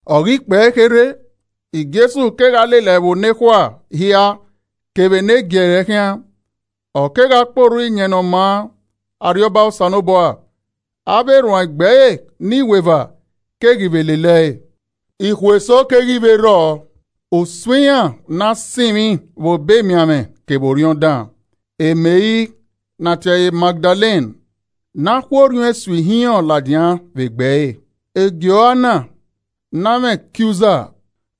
Ọ ghi kpẹe kherhe, Jesu kegha lele ẹvbo nekhua hia kevbe ne giẹrẹ khian, ọ kegha kpe orhu Iyẹn Ne ọ Maa Arriọba Osanobua. Avbe erhuanegbe ẹre ne iweva keghi vbe lele ẹe. Ikhuo eso keghi vbe rrọọ, usun iran ne a sinmwi vbe obọ emianmwẹ kevbe orhiọn dan: Meri (ne a tie ẹre Magdalen) ne a khu orhiọn esu ihinrọn ladian vbe egbe ẹre. Joana ne amwẹ Kiuza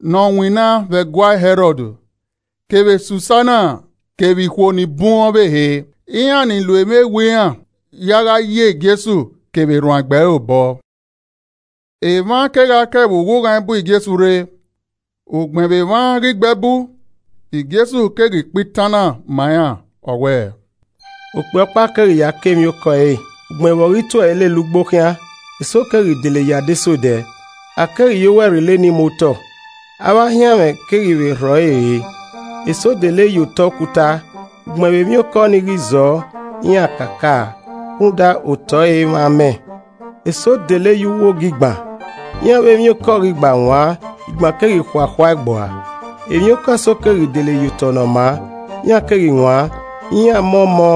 ne ọ winna vbe ẹguae Hẹrọd, kevbe Susana kevbe ikhuo ni bun ọvbehe, iran ni lo emwi ewe iran ya gha yi Jesu kevbe erhuanegbe ẹre obọ. Emwa kegha ke ẹvbo ughughan bu Jesu rre. Ugbẹn vbe emwa ghi gbe ẹbu, Jesu keghi kpa itan na ma iran, ọ wẹẹ: “Okpia ọkpa keghi ya kọ emwiokọ ẹre, ugbẹn Vbe ọ ghi tu ẹe lele ugbo khian, eso keghi dele ye adesẹ odẹ, a keghi ye owẹ rrilo eni mu otọ, avbe ahianmwẹ keghi vbe rhọ ẹre re. Eso dele ye otọ okuta, ugbẹn vbe emwiokọ ni ghi zọọ, iran kakaa, rhunmwuda otọ ẹre imwẹ amẹ. Eso dele ye uwu ogigban, iran vbe emwiokọ ghi gba wan, igban keghi khuakhua ẹe gbua. Emwiokọ eso keghi dele ye otọ ne ọ maa, iran keghi wan, iran mọ ọmọ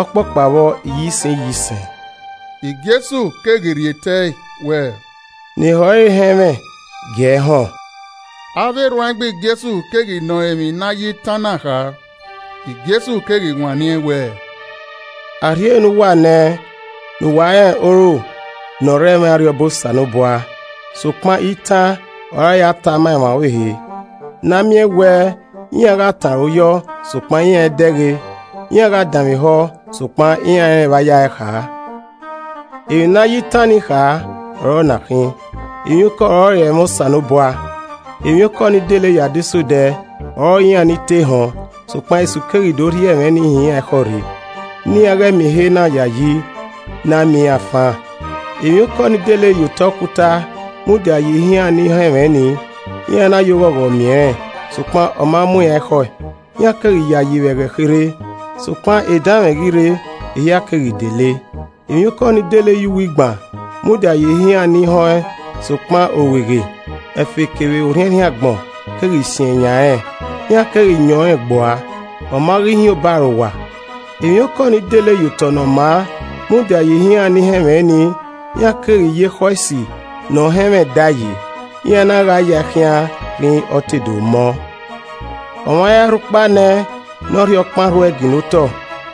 ọkpọkpa vbọ iyisẹn iyisẹn.” Jesu keghi rhie tẹe wẹẹ, “Ne ehọ re họn ẹmwẹ gie ẹre họn.” Avbe erhuanegbe Jesu keghi nọ rẹn emwi ne a ya ẹe itan na kha. Jesu keghi wanniẹn wẹẹ, “A rhie ne uwa nẹ ne uwa rẹn oro ne ọ rre ẹmwẹ Arriọba Osanobua, sokpan itan ọre a ya tae ma emwa ọvbehe ne a miẹn wẹ iran gha tọn aro yọọ, sokpan iran i dẹghe, iran gha danmwehọ sokpan iran i rẹn evba yae kha. “Emwi ne a ye itan ni kha ọ na khin. Emwiokọ ọrọre ẹmwẹ Osanobua, Emwiokọ ni dele ye adesẹ odẹ ọrọre iran ni te họn, sokpan esu keghi do rhie ẹmwẹ ni hin iran ekhọe rre, ne iran ghẹ miẹn ehe na yayi ne a miẹn iran fan. Emwiokọ ni dele ye otọ okuta mudia ye ihe iran ni họn ẹmwẹ nii, iran na ye oghọghọ miẹn rẹn, sokpan ọ ma mu iran ekhọe, iran keghi yayi vbe ẹghẹ kherhe, sokpan edanmwẹ ghi rre, ehia keghi dele. Emwiokọ ni dele ye uwu igban mudia ye ihe iran ni họn ẹn sokpan orueghe, ẹfe kevbe orhiẹnrhiẹn agbọn keghi siẹn yan rẹn, iran keghi yẹn ọnrẹn gbua, ọ ma ghi hin obọ arowa. Emwiokọ ni dele ye otọ ne ọ maa mudia ye iran ni họn ẹmwẹ ni, iran keghi ye ekhọe esi nọ họn ẹmwẹ dae yi, iran na gha ya ẹe khian rhinrin ọ te do mọ. “Ọmwa i ra rhu ukpa nẹ ne ọ rhie okpan rhu ẹe ginna otọ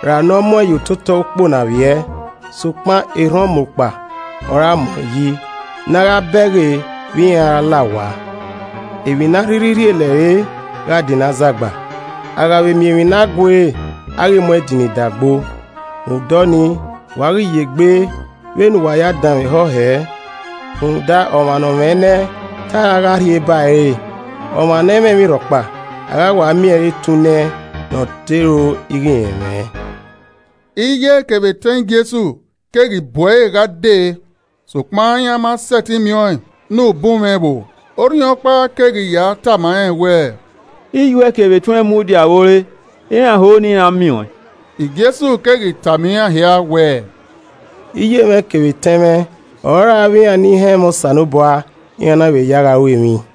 ra ne ọ mu ẹn ye ototọ ukpo na vbiẹ. Sokpan erhan ọmukpa ọre a mu ẹn yi ne emwa miẹn ehe na gha bẹghe vbe iran a ra la owa. “Emwi ne a rhirhi rhie lẹre gha dinna azagba, a gha vbe miẹn emwi ne a guere a ghi mu ẹn dinna idagbo. “Rhunmwuda ọnii, wa ghi ye egbe vbene uwa ya danmwehọ hẹ, rhunmwuda ọmwa nọ mwẹ nẹ, te a ra gha rhie ba ẹre re, ọmwa ne ẹ i mwẹ emwi rhọkpa, a gha wa miẹn ẹre etunnẹ ne ọ te ro ighẹ irẹn mwẹ.” Iye kevbe etẹn Jesu keghi bu ẹre gha dee sokpan iran ma sẹtin miẹn ọẹn ne ubunmwẹ ẹvbo. Orhiọnkpa keghi ya tama rẹn wẹ, “Iye uẹ kevbe etuẹn mudia vbe ore iran ho ne iran miẹn uẹn.” Jesu keghi tama iran hia wẹẹ, “Iye mwẹ kevbe etẹn mwẹ ọrọre avbe iran ni họn ẹmwẹ Osanobua, iran na vbe ya ẹe gha ru emwi.”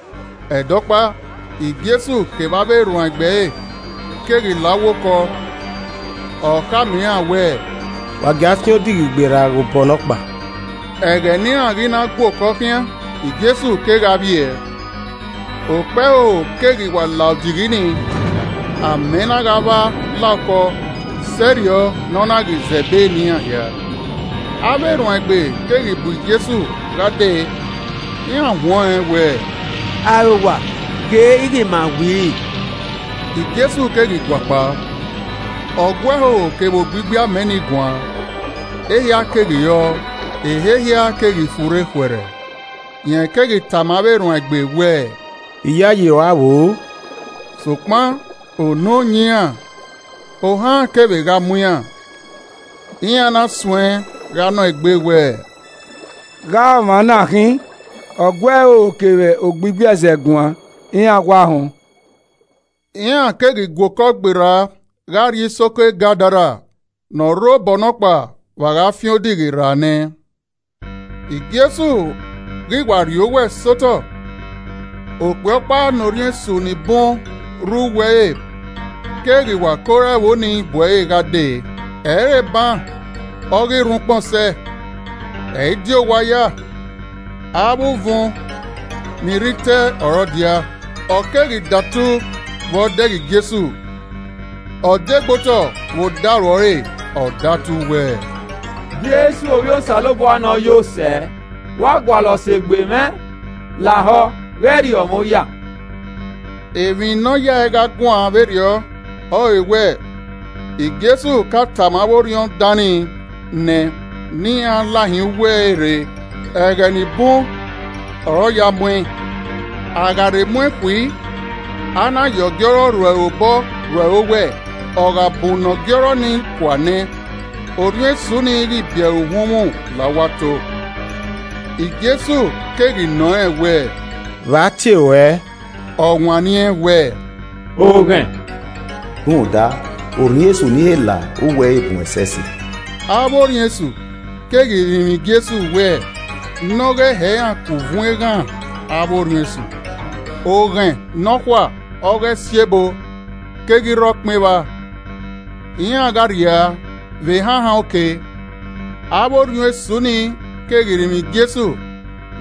Ẹdẹ ọkpa, Jesu kevbe avbe erhuanegbe ẹre keghi la uwu okọ, ọ khama iran wẹẹ, “Wa gie a fian odighi gberra ghe obọ nọkpa.” Ẹghẹ ne iran ghi na gua okọ khian, Jesu kegha vbiẹ. Okpẹhoho keghi wa la odighi ni, amẹ na gha vba la okọ sẹrriọ ne ọ na ghi zẹ ẹbe ne iran hia. Avbe erhuanegbe keghi bu Jesu gha dee, iran huẹn ọnrẹn wẹẹ, “Arowa ghe ighe ma wiri!” Jesu keghi gua kpao, ọ gu ẹhoho kevbe ogbigbi amẹ ni guan, ehia keghi rọọ, ehe hia keghi furre khuẹrhẹ. Rẹn keghi tama avbe erhuanegbe wẹẹ, “Iyayi rua vboo?” Sokpan unu yan iran, ohan kevbe gha mu iran, iran na suẹ gha nọ egbe wẹ, “Gha ọmwa na khin? Ọ gu ẹhoho kevbe ogbigbi ẹzẹ guan, iran wa họn.” Iran keghi gua okọ gberra gha rrie isoko Gadara ne ọ rre obọ nọkpa vbe a gha fian odighi rra nẹ. Jesu ghi wa rhie owẹ sẹ otọ, okpia ọkpa ne orhiọn esu ni bun rre uwu ẹre keghi wa ke ore ẹvbo ni bu ẹre gha dee. Ẹ i re eban ọ ghi rhuan ukpọn sẹ, ẹ i di owa ya, avbe uvun ni rre itẹ ọre ọ dia. Ọ keghi datu vbe ọ dẹghe Jesu, ọ degbe otọ vbe odaro ọre ọ datu wẹẹ, “Jesu Ovbi Osanobua Ne Ọ Yo Sẹ, vbe ua gualọ sẹ egbe mwẹ? Lahọ ghẹ rriọ mwẹ oya.” Emwi ne ọ a ya ẹe gha guan vberriọ ọrọre wẹ Jesu ka tama avbe orhiọn dan nii nẹ ne iran lahin uwu ẹre rre. Ẹghẹ ni bun ọre ọ ya mu ẹn, a gha rhe mu ẹn khui, a na ye ọgiọrọ rro ẹre obọ rro ẹre owẹ, ọ gha bunnọ ọgiọrọ ni kua nẹ, orhiọn esu ni ghi bi ẹre, uhunmwu la uwu ato. Jesu keghi nọ rẹn wẹ, “Vbe a tie ruẹ?” Ọ wanniẹn wẹẹ, “Oghẹn,” rhunmwuda orhiọn esu ni he la uwa ẹre bun ẹsẹse. Avbe orhiọn esu keghi rinmwian Jesu wẹ ne Ọ ghẹ hẹ iran ku uvun eghan avbe orhiọn esu. Oghẹn nọkhua ọghe esiebo keghi rre ọkpẹn evba. Iran gha rria vbe ehanhan oke. Avbe orhiọn esu ni keghi rinmwian Jesu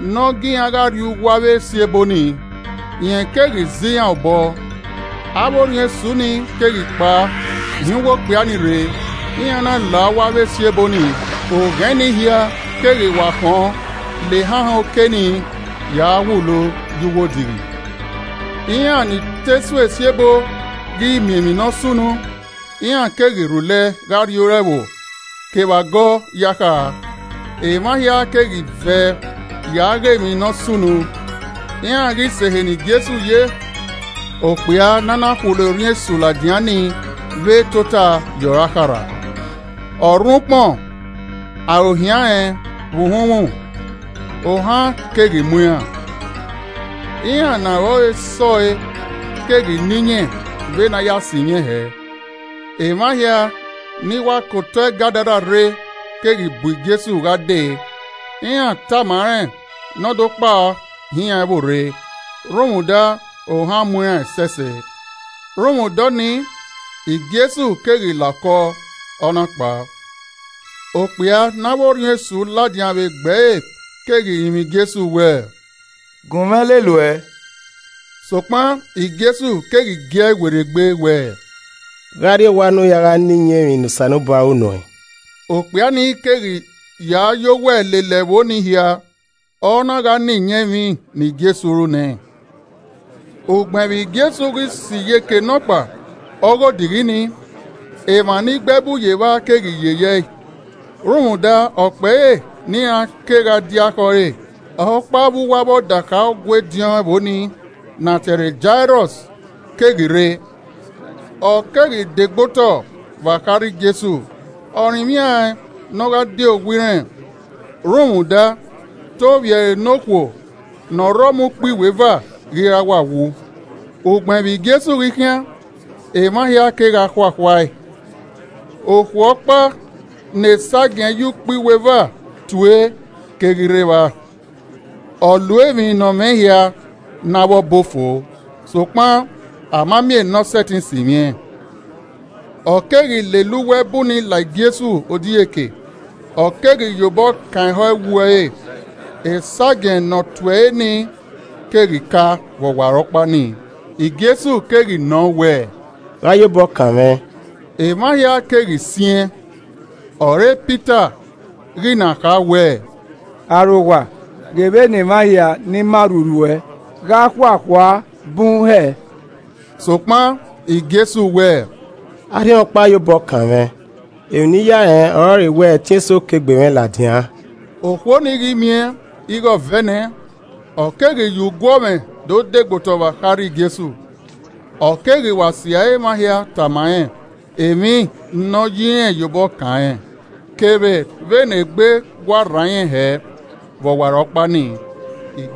ne ọ gie iran gha rrie uwu avbe esiebo ni, rẹn keghi zẹ iran obọ. Avbe orhiọn esu ni keghi kpao hin uwu okpia ni rre, iran na la uwu avbe esiebo ni, oghẹn ni hian keghi wa khọn lele ehanhan oke ni ya wulo ye uwu odighi. Iran ni te su esiebo ghi miẹn emwi ne ọ sunu, iran keghi rhulẹ gha rrie ore ẹvbo kevbe agọ ya kha. Emwa hia keghi vẹ ya gha ghe emwi ne ọ sunu. Iran ghi sẹ ehe ne Jesu ye iran keghi do vba okpia ne a na khulo orhiọn esu ladian ni vbe tota ye ọre akharha, ọ rhuan ukpọn, aro hian rẹn vbe uhunmwu, ohan keghi mu iran. Iran ne aro ẹre sẹ ọe keghi na iyẹn vbene a ya sinmwi ẹn hẹẹ. Emwa hia ni wa ke otọ Gadara rre keghi bu Jesu gha dee, iran tama rẹn ne ọ do kpao hin iran ẹvbo rre rhunmwuda ohan mu iran ẹsẹse. Rhunmwuda ọnii, Jesu keghi la okọ, ọ na kpao. Okpia ne avbe orhiọn esu ladian vbe egbe ẹre keghi rinmwian Jesu wẹẹ, “Gun mwẹ lele uẹ.” Sokpan Jesu keghi gie ẹe werriegbe wẹẹ, “Gha rrie owa ne u ya gha na iyẹn emwi ne Osanobua ru nuẹn.” Okpia ni keghi ya yọ owẹ lele ẹvbo nii hia, ọ na gha na iyẹn emwi ne Jesu ru nẹẹn. Ugbẹn vbe Jesu ghi sẹ iyeke nọkpa ọghe odighi nii, emwa ni gbe ẹbu ye evba keghi gbe ọbokhian ne ẹn rhunmwuda, ọkpẹre ne iran kegha dia khẹ ọre. Ọkpa vbe uwu avbe ọdakha Ọgua ediọn ẹvbo nii ne a tie ẹre Jairọs keghi rre. Ọ keghi de gbe otọ vbe akharha Jesu, ọ rinmwian ẹn ne ọ gha die owa irẹn. Rhunmwuda te ovbi ẹre ne okhuo ne ọ rre ọmọ ukpo iweva ghi ra wa wu. Ugbẹn vbe Jesu ghi khian, emwa hia kegha khuakhua ẹe, okhuo ne esagiẹn ye ukpo iweva tue, keghi rre evba. Ọ lo emwi ne ọ mwẹ hia ne avbe ọbo fo, sokpan a ma miẹn ne ọ sẹtin sinmwi ẹn. Ọ keghi lele uwu ẹbu nii la Jesu odieke, ọ keghi ye obọ kan ehọ ẹwu ẹre, esagiẹn ne ọ tue ẹre nii keghi ka vbe ọwarọkpa nii. Jesu keghi nọ wẹẹ, “Gha ọ ya obọ kan mwẹ?” Emwa hia keghi siẹn, ọre Pita ghi na kha wẹ, “Arowa, ghe vbene emwa hia ni ma rhurhu uẹ gha khuakhua a bun hẹ.” Sokpan Jesu wẹ, “Arhiọnkpa ya obọ kanmwẹ. Emwi ne I ya rẹn ọrọre wẹ ẹtin eso ke egbe mwẹ ladian.” Okhuo ni ghi miẹn ighe ọ vẹ nẹ, ọ keghi ye uguọmwẹ do de gbe otọ vbe akharha Jesu. Ọ keghi wa sirra emwa hia tama rẹn emwi ne ọ ya irẹn ya obọ kan rẹn, kevbe vbe ne egbe wa rran irẹn hẹ vbe ọwarọkpa nii.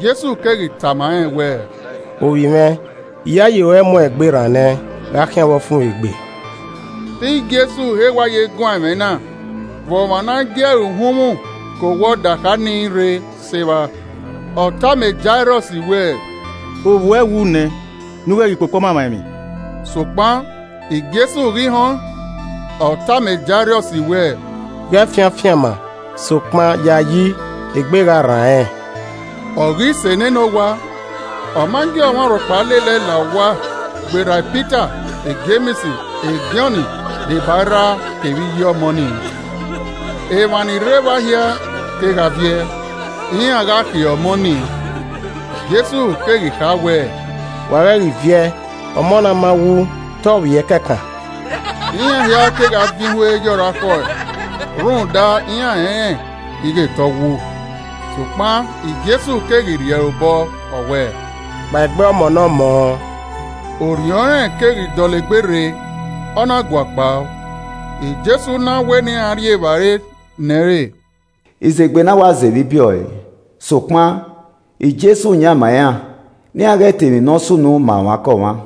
Jesu keghi tama rẹn wẹẹ, “Ovbi mwẹ, iyayi ruẹ muẹn egbe rran nẹ. Gha khian vbe ọfumwegbe.” Te Jesu he wa ye guan ẹmwẹ na vbe ọmwa ne a gie ẹre uhunmwu ke owa ọdakha nii rre sẹ evba, ọ tama Jairọs wẹẹ, “Ovbi uẹ wu nẹ ne u ghẹ ghi kpokpo ọmamwaemwi.” Sokpan Jesu ghi họn, ọ tama Jairọs wẹẹ, “Ghẹ fian afianma, sokpan yayi, egbe gha rran rẹn.” Ọ ghi sẹ nene owa, ọ ma gie ọmwa rhọkpa lele ẹe la owa gberra Pita, Jems, Jọn, deba erha kevbe iye ọmọ nii. Emwa ni rre evba hia kegha viẹ, iran gha khiẹ ọmọ nii, Jesu keghi kha wẹẹ, “Wa ghẹ ghi viẹ, ọmọ na ma wu, te ọ vbiẹ kẹkan!” Iran hia kegha vin ihue ye ọre akhọe rhunmwuda iran rẹnrẹn ighe te ọ wu. Sokpan Jesu keghi rhie ẹre obọ, ọ wẹẹ, “Kpaegbe ọmọ ne ọmọ!” Orhiọn rẹn keghi dọlegbe rre, ọ na gua kpao, Jesu na wẹ ne iran rhie evbare nẹ ẹn re. Izegbe na wa zẹ evbibiẹ ọe, sokpan Jesu yan ma iran ne iran ghẹ ta emwi ne ọ sunu ma ọmwaikọmwa.